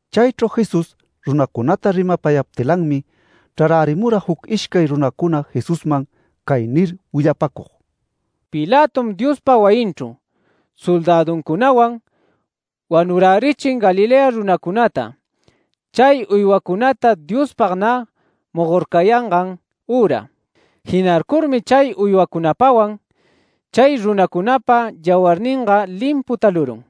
Chaychru Jesús runacunata rimapayaptilanmi, chrarärimura juc ishcay runacuna Jesusman cay nir willapäcug: “Pilatom Diospa wayinchru soldäduncunawan wanurärichin Galilea runacunata chay uywancunata Diospag nä mogorcayangan üra. Jinarcurmi chay uywacunapawan chay runacunapa yawarninga limpu talurun”.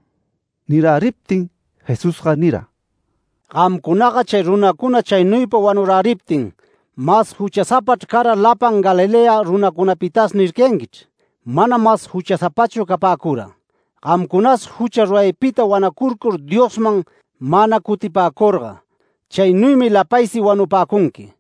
Niräriptin Jesusga nira: “ ‘Gamcunaga chay runacuna chaynuypa wanuräriptin, mas juchasapachr cara lapan Galilea runacunapitas’ nircayanquichr. Manam mas juchasapachu capäcura. Gamcunas jucha ruraypita wanacurcur Diosman mana cutipäcurga, chaynuymi lapaysi wanupäcunqui.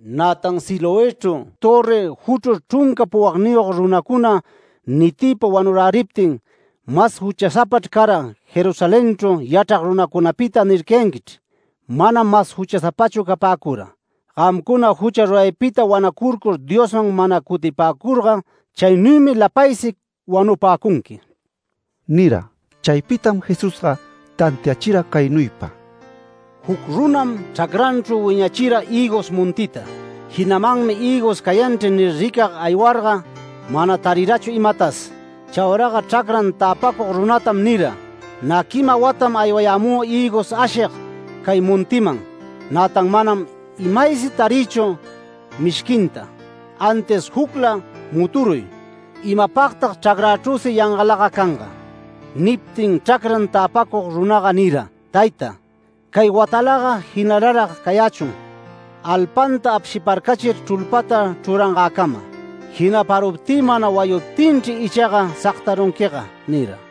Nätan ‘Siloëchru törri juchrur chrunca puwagniyog runacuna nitiypa wanurachiptin, mas juchasapachr cara Jerusalenchru yachrag runacunapita’ nircayanquichr. Manam mas juchasapachu capäcura. Gamcuna jucha ruraypita wanacurcur Diosman mana cutipäcurga, chaynuymi lapaysi wanupäcunqui” nira. Chaypitam Jesusga tantiachira caynuypa: “Juc runam chracranchru wiñachira hïgos montita. Jinamanmi ‘Hïgos cayanchri’ nir, ricag aywarga mana tarirachu imatas. Chauraga chracran täpacug runatam nira: ‘Nä quima watam aywayämü hïgos ashig cay montiman. Nätan manam imaysi tarïchu mishquinta, antis jucla muturuy. ¡Imapagtag chracrachrüsi yangalaga canga!’ Niptin chracran täpacug runaga nira: ‘Tayta, cay watalaga jinalarag cayächun, alpanta apshiparcachir chrulpata chrurangäcama. Jinaparuptï mana wayuptinchri ichaga sagtarunquiga’ nira”.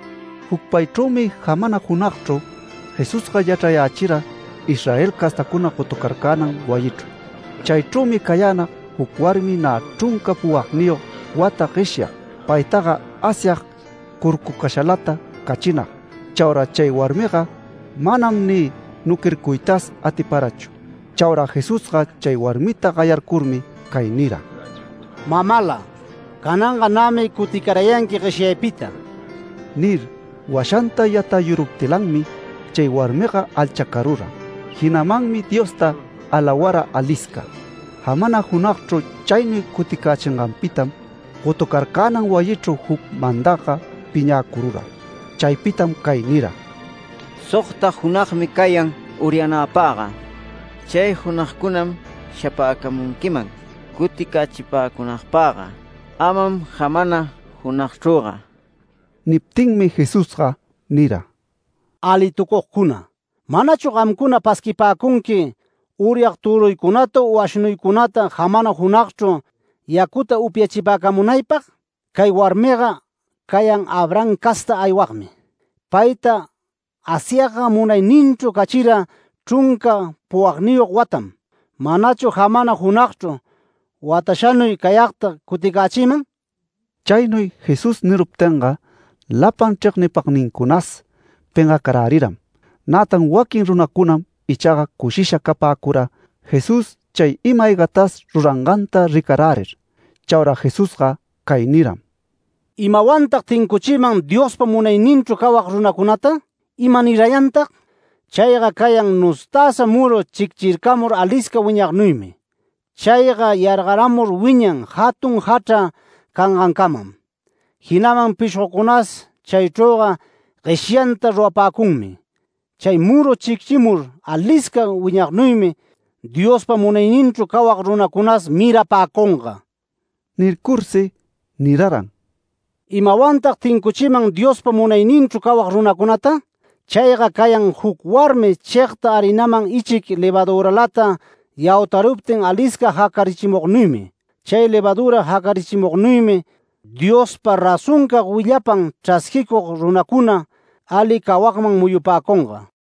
Jucpaychrümi jamana junagchru, Jesusga yachrayächira Israel castacuna gotucarcänan wayichru. Chaychrümi cayänag juc warmi nä chrunca puwagniyog wata gueshyag. Paytaga Asyag curcucashalata cachinag. Chaura chay warmiga manam ni nuquircuytas atiparachu. Chaura Jesusga chay warmita gayarcurmi cay nira: “Mamala, cananga nämi cuticarayanqui gueshyaypita” nir, washanta yatayuruptilanmi chay warmiga alchacarura. Jinamanmi Diosta alawara alisca. Jamana junagchru chaynuy cuticächinganpitam, gotucarcänan wayichru juc mandagga piñäcurura. Chaypitam cay nira: “Sogta junagmi cayan uryanapagga. Chay junagcuna shapäcamunquiman cuticächipäcunaypagga, amam jamana junagchrüga”. Niptinmi Jesusga nira: “¡Alitucugcuna! ¿Manachu gamcuna pasquipäcunqui uryag töruycunata u ashnuycunata jamana junagchru yacuta upyachipäcamunaypag? Cay warmiga cayan Abraham castan aywagmi. Payta Asyagga munayninchru cachira chrunca puwagniyog watam. ¿Manachu jamana junagchru watashatanuy cayagta cuticächïman?” Chaynuy Jesús niruptinga, lapan chregnipagnincunas pengacaräriram. Nätan waquin runacunam ichaga cushisha capäcura Jesús chay ima-aygatas ruranganta ricarärir. Chaura Jesusga cay niram: “¿Imawantag tincuchïman Diospa munayninchru cawag runacunata? ¿Imanirayantag? Chayga cayan nustäsa muru chicchircamur alisca wiñagnuymi. Chayga yargaramur wiñan jatun jachra cangancamam. Jinaman pishgocunas chaychrüga gueshanta rurapäcunmi. Chay muru chicchimur alisca wiñagnuymi. Diospa munayninchru cawag runacunas mirapäcunga”. Nircursi niraran: “¿Imawantag tincuchïman Diospa munayninchru cawag runacunata? Chayga cayan juc warmi chegta harinaman ichic levaduralata yautaruptin alisca jacarichimugnuymi. Chay levadura jacarichimugnuymi Diospa razoncag willapan chrasquicug runacuna, ali cawagman muyupäcunga”.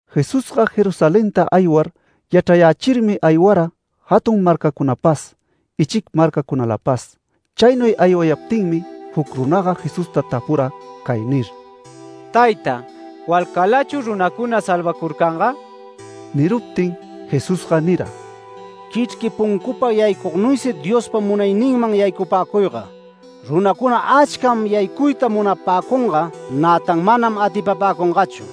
Jesusga Jerusalenta aywar, yachrayächirmi aywara jatun marcacunapas, ichic marcacunalapas. Chaynuy aywayaptinmi juc runaga Jesusta tapura cay nir: “Tayta, ¿walcalachu runacuna salvacurcanga?” Niruptin Jesusga nira: “Quichrqui puncupa yaycugnuysi Diospa munayninman yaycapäcuyga. Runacuna achcam yaycuyta munapäcunga, nätan manam atipapäcungachu.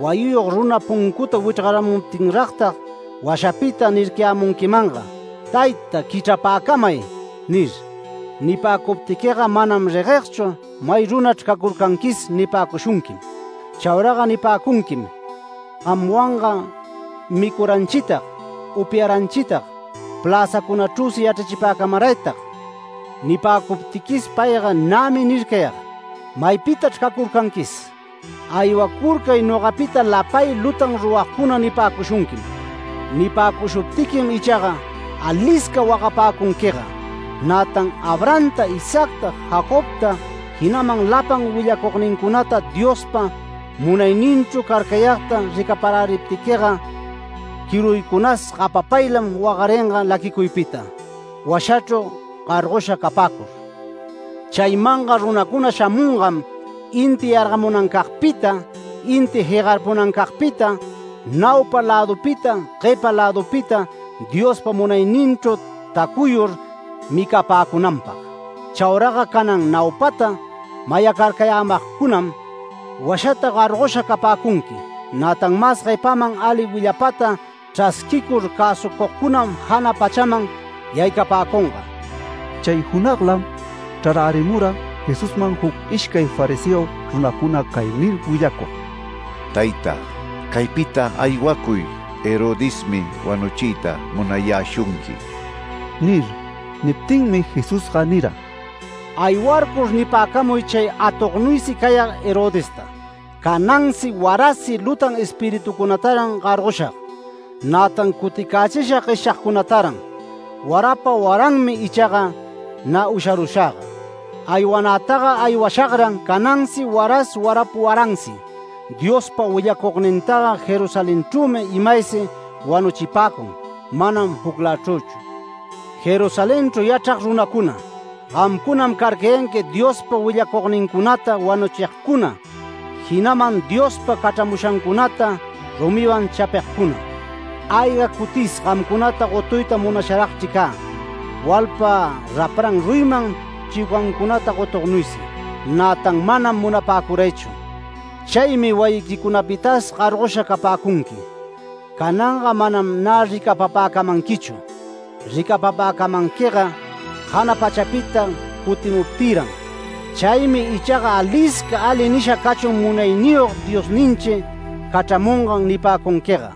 Wayiyog runa puncuta wichrgaramuptinragtag, washapita nircayämunquimanga, ‘Tayta, quichrapäcamay’ nir. Nipäcuptiquiga ‘Manam reguegchu may runachr cacurcanquis’ nipäcushunquim. Chauraga nipäcunquim: ‘Gamwanga micuranchitag, upyaranchitag, pläzäcunachrüsi yachrachipäcamaraytag’. Nipäcuptiquis payga ‘Nämi nircayag: ¡Maypitachr cacurcanquis! ¡Aywacurcay nogapita lapay lutan ruragcuna!’ nipäcushunquim. Nipäcushuptiquim ichaga alisca wagapäcunquiga. Nätan Abrahamta, Isaacta, Jacobta, jinaman lapan willacugnincunata Diospa munayninchru carcayagta ricaparäriptiquiga quiruycunas gapapaylam wagaringa laquicuypita, washachru gargosha capäcur. Chaymanga runacuna shamungam inti yargamunancagpita, inti jegarpunancagpita, naupa lädupita, guepa lädupita Diospa munayninchru tacuyur micapäcunanpag. Chauraga canan naupata mayacarcayämagcunam, washaman gargosha capäcunqui. Nätan mas guepaman ali willapata chrasquicur cäsucugcunam jana pachaman yaycapäcunga”. Chay junaglam chrarärimura Jesusman juc ishcay fariseo runacuna cay nir willacug: “Tayta, caypita aywacuy. Herodesmi wanuchiyta munayäshunqui” nir. Niptinmi Jesusga nira: “Aywarcur nipäcamuy chay atognuysi cayag Herodesta: ‘Canansi warasi lutan espiritucunataran gargoshag. Nätan cuticächishag gueshyagcunataran. Warapa waranmi ichaga nä usharushagga’. Aywanätaga aywashagran canansi waras warapa waransi. Diospa willacugnintaga Jerusalenchrümi imaysi wanuchipäcun, manam juclächrüchu. ¡Jerusalenchru yachrag runacuna, gamcunam carcayanqui Diospa willacugnincunata wanuchigcuna, jinaman Diospa cachramushancunata rumiwan chapigcuna! ¡Ayga cutis gamcunata gotuyta munasharagchri cä, walpa rapran ruyiman chiucancunata gotugnuysi! Nätan manam munapäcuraychu. Chaymi wayiquicunapitas gargosha capäcunqui. Cananga manam nä ricapapäcamanquichu. Ricapapäcamanquiga jana pachapita cutimuptïran. Chaymi ichaga ‘Alisca ali nisha cachun Munayniyog Diosninchi cachramungan’ nipäcunquiga”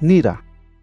nira.